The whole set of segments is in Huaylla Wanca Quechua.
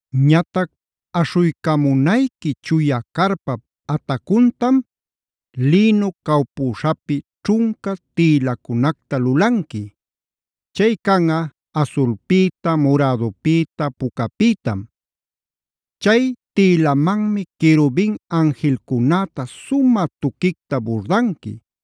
“Ñatac aśhuycamunayqui chuya carpap atacuntam lïnu cawpüśhapi ćhunca tïlacunacta lulanqui. Chay canꞌa asulpïta, murädupïta, pucapïtam. Chay tïlanmanmi querubin anjilcunäta sumä tuquicta burdanqui.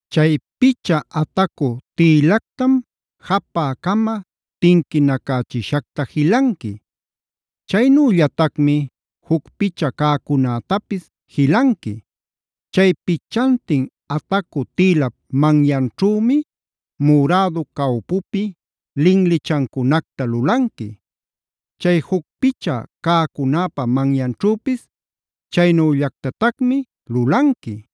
Chay picha atacu tïlactam japä-cama tinquinacächishacta jilanqui. Chaynüllatacmi juc picha cäcunätapis jilanqui. Chay pichantin atacu tïlap manyanćhümi murädu cawpupi linlichancunacta lulanqui. Chay juc picha cäcunäpa manyanćhüpis chaynüllactatacmi lulanqui.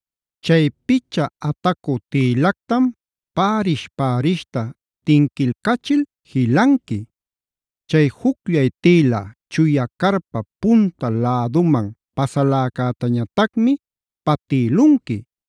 Chay picha atacu tïlactam pärish-pärishta tinquilcachil jilanqui. Chay jucllay tïla chuya carpap punta läduman pasaläcätañatacmi patïlunqui.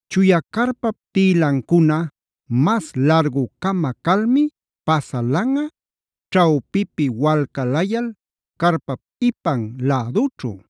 Chuya carpap tïlancuna mas largu-cama calmi pasalanꞌa, ćhawpipi walcalayal carpap ipan lädućhu.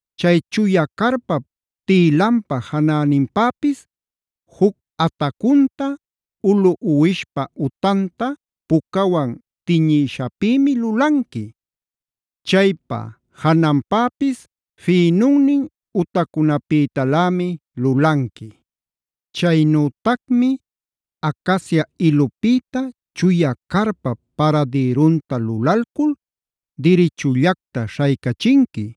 “Chay chuya carpap tïlanpa janäninpäpis juc atacunta ulu uwishpa utanta pucawan tiñïshapïmi lulanqui. Chaypa jananpapis fïnunnin utacunapïtalämi lulanqui. “Chaynütacmi acacia ilupïta chuya carpap paradïrunta lulalcul dirichullacta śhaycachinqui.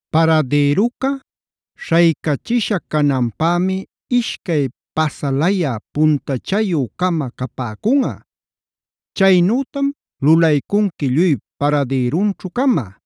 Paradïruca śhaycachisha cananpämi ishcay pasalayä puntachayü-cama capäcunꞌa. Chaynütam lulaycunqui lluy paradïrunćhu-cama.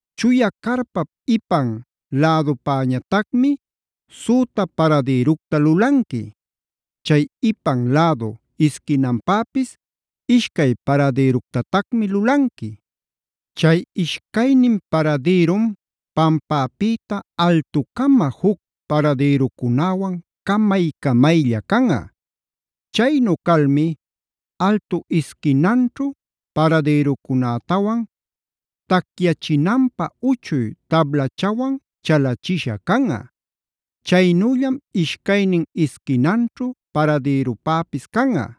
Chuya carpap ipan lädupäñatacmi süta paradïructa lulanqui. Chay ipan lädu isquinanpäpis ishcay paradïructatacmi lulanqui. Chay ishcaynin paradïrum pampäpïta altucama juc paradïrucunäwan camay-camaylla canꞌa. Chaynu calmi altu isquinanćhu paradïrucunätawan tacyachinanpä uchuy tablachawan chalachisha canꞌa. Chaynüllam ishcaynin isquinanćhu paradïrupäpis canꞌa.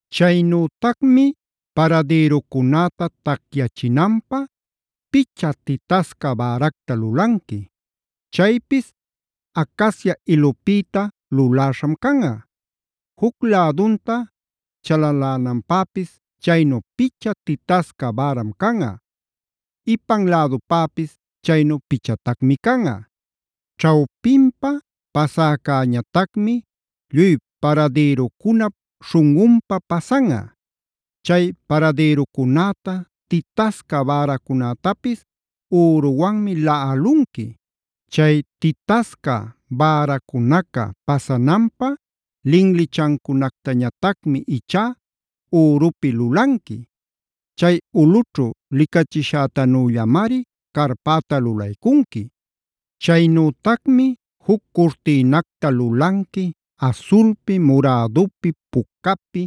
“Chaynütacmi paradïrucunäta tacyachinanpä picha titasca bäracta lulanqui. Chaypis acacia ilupïta luläśham canꞌa. Juc lädunta chalalänanpäpis chaynu picha titasca bäram canꞌa. Ipan lädupäpis chaynu pichatacmi canꞌa. Ćhawpinpa pasäcäñatacmi lluy paradïrucunap śhunꞌunpa pasanꞌa. Chay paradïrucunäta, titasca bäracunätapis üruwanmi laꞌalunqui. Chay titasca bäracunaca pasananpä linlichancunactañatacmi ichá ürupi lulanqui. Chay ulꞌućhu licachishätanüllamari carpäta lulaycunqui. “Chaynütacmi juc curtïnacta lulanqui asulpi, murädupi, pucapi,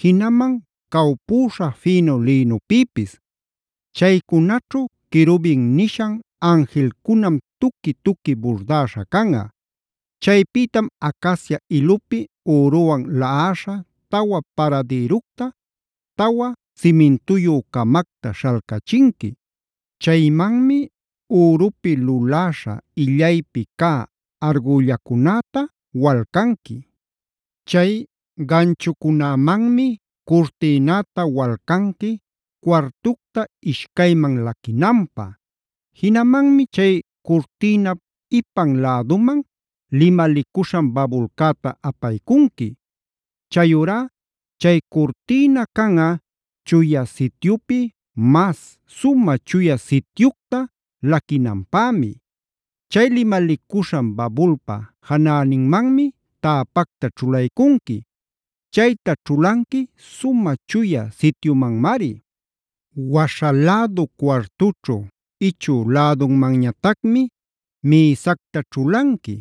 jinaman cawpüśha fïnu lïnupïpis. Chaycunaćhu querubin nishan anjilcunam tuqui-tuqui burdäśha canꞌa. Chaypïtam acacia ilupi üruwan laꞌäśha tawa paradïructa, tawa simintuyü-camacta śhalcachinqui. Chaymanmi ürupi luläśha illaypi cä argüllacunäta walcanqui. Chay ganchucunämanmi curtïnäta walcanqui cuartucta ishcayman laquinanpä. Jinamanmi chay curtïnap ipan läduman limalicuśhan babulcäta apaycunqui.a Chayurá chay curtïna canꞌa Chuya Sityupi mas Sumä Chuya Sityucta laquinanpämi. Chay limalicuśhan babulpa janäninmanmi täpacta ćhulaycunqui. Chayta ćhulanqui Sumä Chuya Sityumanmari. Waśha lädu cuartućhu ichü lädunmanñatacmi mïsacta ćhulanqui.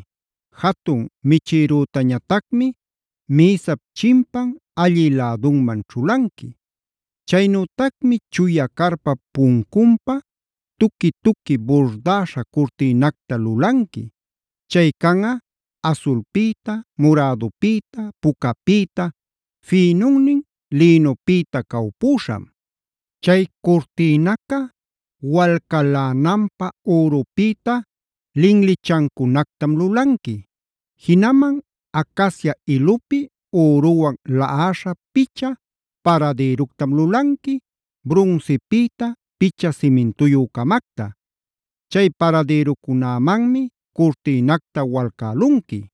Jatun michïrütañatacmi mïsap chimpan allï lädunman ćhulanqui. “Chaynütacmi chuya carpap puncunpä tuqui-tuqui burdäśha curtïnacta lulanqui. Chay canꞌa asulpïta, murädupïta, pucapïta, fïnunnin lïnupïta cawpüśham. Chay curtïnaca walcalänanpä ürupïta linlichancunactam lulanqui. Jinaman acacia ilupi üruwan laꞌäśha picha paradïructam lulanqui, brunsipïta picha simintuyü-camacta. Chay paradïrucunämanmi curtïnacta walcälunqui.